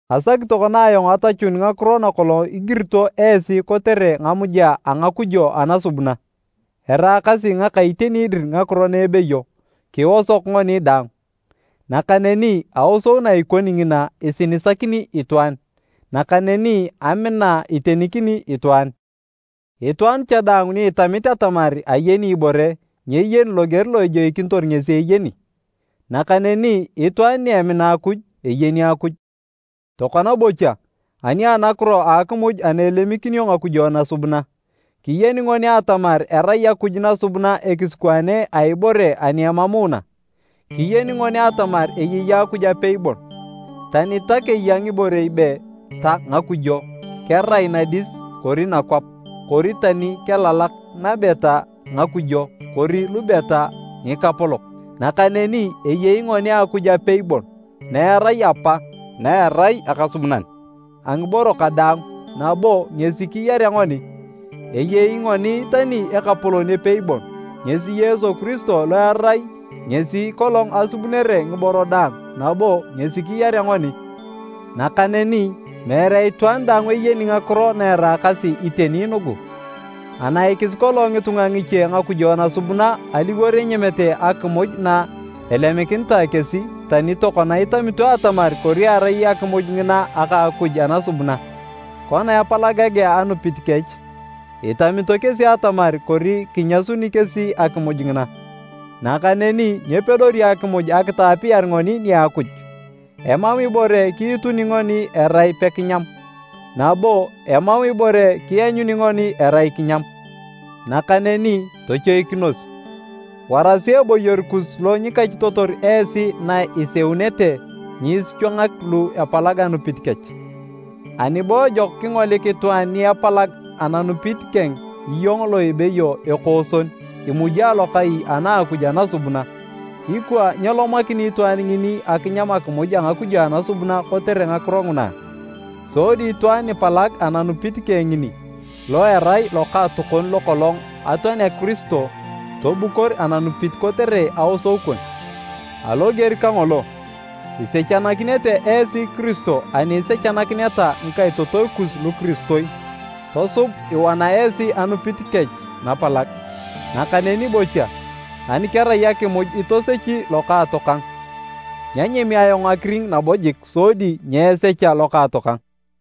Asaki tokona ayong atachun ngakiro nakolong igirito esi kotere ngamuja a ngakujo anasubuna. Eraakasi ngaka iteni dir ngakiro na ebeyo, “Kiosok ngoni daang”. Nakaneni aosou na ikoni ngina, isinisakini itwaan, nakaneni amina itenikini itwaan. Itwaan cha daang ni itamit atamar ayeni ibore, nyeyeni loger lo ejoikinitor ngesi eyeni. Nakaneni itwaan ni emina Akuj, eyeni Akuj. Tokona bocha, ani anakiro a akimuj ana elemikinio ngakujo nasubuna, kiyeni ngoni atamar erai akuj nasubuna ekisikwaane a ibore ani emamuuna. Kiyeni ngoni atamar eyei Akuj apei bon. Tani ta keya ngiborei be, “ta ngakujo,” kerai nadis kori nakwap, kori tani kelalak nabe ta, “ngakujo” kori lube ta, “ngikapolok,” nakaneni eyei ngoni Akuj apei bon, na erai Apa, na erai akasubunan a ngiboro kadaang nabo ngesi kiyarea ngoni. Eyei ngoni tani Ekapolon epei bon, ngesi Yesu Kiristo lo erai ngesi kolong asubunere ngiboro daang nabo ngesi kiyarea ngoni. Nakaneni meere itwaan daang eyeni ngakiro na eraakasi iteni nugu. Anaikis kolong ngitunga ngiche ngakujo nasubuna aliwor enyamete akimuj na elemikinitae kesi tani tokona itamito atamar kori erai akimuj ngina aka a akuj anasubuna. Kona epalagagea anupit kech, itamito kesi atamar kori kinyasuni kesi akimuj ngina. Nakaneni nyepedori akimuj akitaapiyar ngoni nia Akuj. Emam ibore kiituni ngoni erai pekinyam, nabo, emam ibore kianyuni ngoni erai kinyam. Nakaneni tochoikinos, warasi eboyor kus lo nyikachitotor esi na iseunete nyiisichwangak lu epalag ananupit kech. Ani bo ejok kingolik itwaan ni epalag ananupit keng iyong lo ebeyo “ekooson” imuji alokai ana a akuj anasubuna, ikwa nyelomakini itwaan ngini akinyam akimuj a ngakujo anasubuna kotere ngakiro nguna a? Sodi itwaan nipalag ananupit keng ngini, lo erai lokaatokon lokolong atoanea Kiristo, tobukor ananupit kotere “aosou” kon! Aloger kangolo, isechanakinete esi Kiristo ani isechanakineta ngikaitotoi kus lukiristoi tosub iwana esi anupit kech napalag. Nakaneni bocha, ani kerai akimuj itosechi lokaatokang, nyanyami ayong akiring nabo jik sodi nyeesecha lokaatokang.